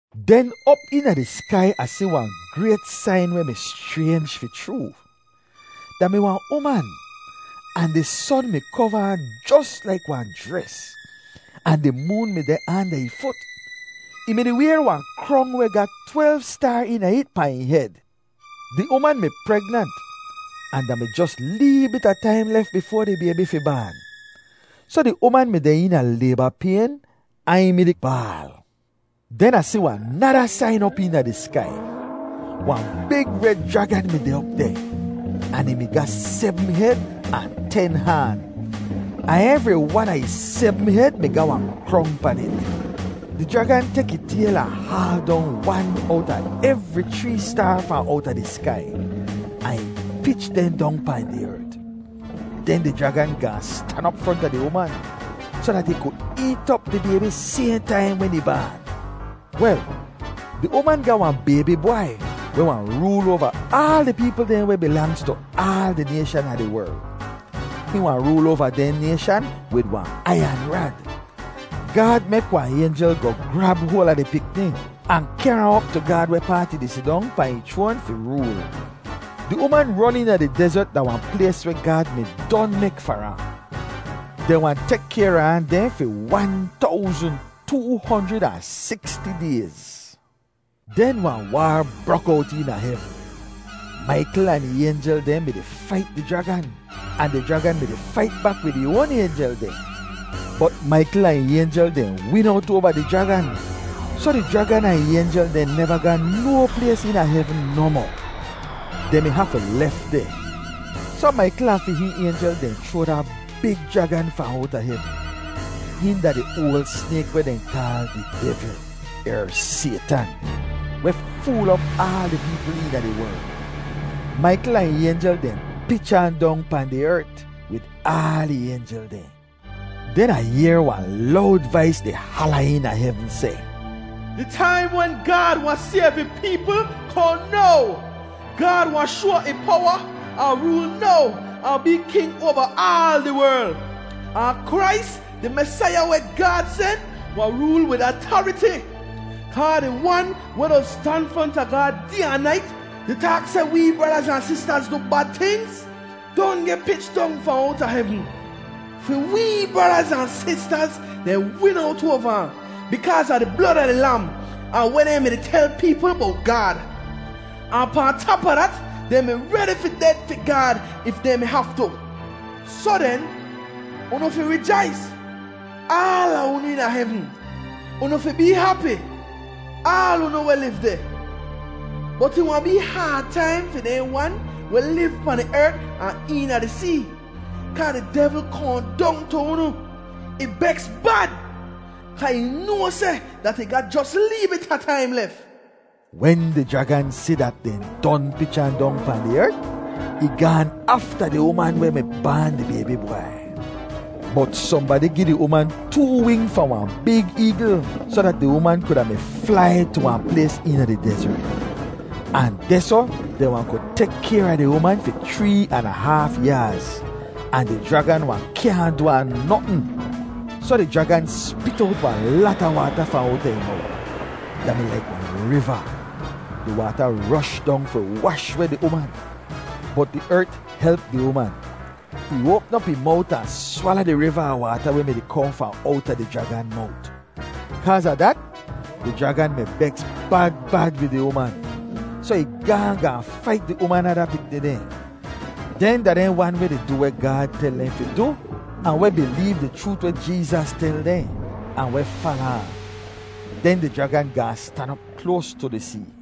Den op eena di skai Ah si wahn grayt sain weh mi schraynj fi chroo. Da mi wahn uman, ahn di son mi kova ahn jos laik wahn jres. Ahn di moon mi deh anda ih fut. Ih mi-di wayr wahn krong weh ga twelv staar eena it pahn ih hed. Di uman mi pregnant, ahn da mi jos lee bit a taim lef bifoa di baybi fi baan. Soh di uman mi deh eena layba payn ahn ih mi-di baal. Den Ah si wahn nada sain op eena di skai. Wahn big red jragan mi deh op deh, ahn ih mi ga sebm hed ahn ten haan. Ahn evri wan a ih sebm hed mi ga wahn krong pan it. Di jragan tek ih tayl ahn haal dong wan owta evri chree staar fahn owta di skai, ahn ih pich dehn dong pahn di ert. Den di jragan gaahn stan op fronta di uman, soh dat ih ku eet op di baybi sayhn taim wen ih baan. Wel, di uman ga wahn baybi bwai, weh wahn rool oava aal di peepl dehn weh bilangz tu aal di nayshan a di werl. Hihn wahn rool oava dehn nayshan wid wahn aiyan rad. Gaad mek wahn aynjel goh grab hoal a di pikni, ahn kehr ahn op tu Gaad wehpaat ih di sidong pahn ih chroan fi rool. Di uman ron eena di dezert da wahn plays weh Gaad mi don mek far ahn. Dehn wahn tek kayr a ahn deh fi wan towzn, too honjrid ahn siksti dayz. Den wahn waar brok owt eena hevn. Maikl ahn ih aynjel dehn mi-di fait di jragan, ahn di jragan mi-di fait bak wid ih oan aynjel dehn. Bot Maikl ahn ih aynjel dehn win owt oava di jragan. Soh di jragan ahn ih aynjel dehn neva ga no plays eena hevn nohmoh. Dehn mi hafu lef deh. Soh Maikl ahn fi hihn aynjel dehn chroa da big jragan fahn owta hevn. Hihn da di oal snayk weh dehn kaal di devl, er Saytan, weh fool op aal di peepl eena di werl. Maikl ahn ih aynjel dehn pich ahn dong pahn di ert, wid aal ih aynjel dehn. Den Ah yehr wahn lowd vais di hala eena hevn seh, “Di taim wen Gaad wahn sayv ih peepl kohn now! Gaad wahn shoa ih powa ahn rool now ahn bee King oava aal di werl! Ahn Krais di Mesaiya weh Gaad sen wahn rool wid atariti! Kaa di wan weh doz stan fronta Gaad day ahn nait, di taak seh dat wee bradaz ahn sistaz du bad tingz, don geh pich dong fahn owta hevn. Fi wee bradaz ahn sistaz dehn win owt oava ahn, bikaaz a di blod a di Lam, ahn weh dehn mi tel peepl bowt Gaad. Ahn pahn tap a dat, dehn mi redi fi ded fi Gaad if dehn mi haftu. Soh den, unu fi rijais, aala unu eena hevn! Unu fi bee hapi, aal unu weh liv deh! Bot ih wahn bee haad taim fi dehn wan weh liv pahn di ert ahn eena di see, kaa di devl kohn dong tu unu! Ih beks bad, kaa ih noa seh dat ih ga jos lee bit a taim lef.” Wen di jragan si dat dehn don pich ahn dong pahn di ert, ih gaan afta di uman weh mi baan di baybi bwai. Bot sohnbadi gi di uman too wing fahn wahn big eegl soh dat di uman kuda mi flai tu wahn plays eena di dezert. Ahn dehsoh dehn wahn ku tek kayr a di uman fi chree an a haaf yaaz. Ahn di jragan wahn kyaahn du ahn notn. Soh di jragan spit owt wahn lata waata fahn owta ih mowt; da mi laik wahn riva. Di waata rosh dong fi wash weh di uman. Bot di ert help di uman. Ih oapm op ih mowt ahn swala di riva a waata weh mi-di kohn fahn owta di jragan mowt. Kaaz a dat, di jragan mi beks bad bad wid di uman. Soh ih gaahn gaahn fait di uman ada pikni dehn. Dehn da dehn wan weh di du weh Gaad tel dehn fi du ahn weh bileev di chroot weh Jeezas tel dehn, ahn weh fala ahn. Den di jragan gaahn stan op kloas tu di see.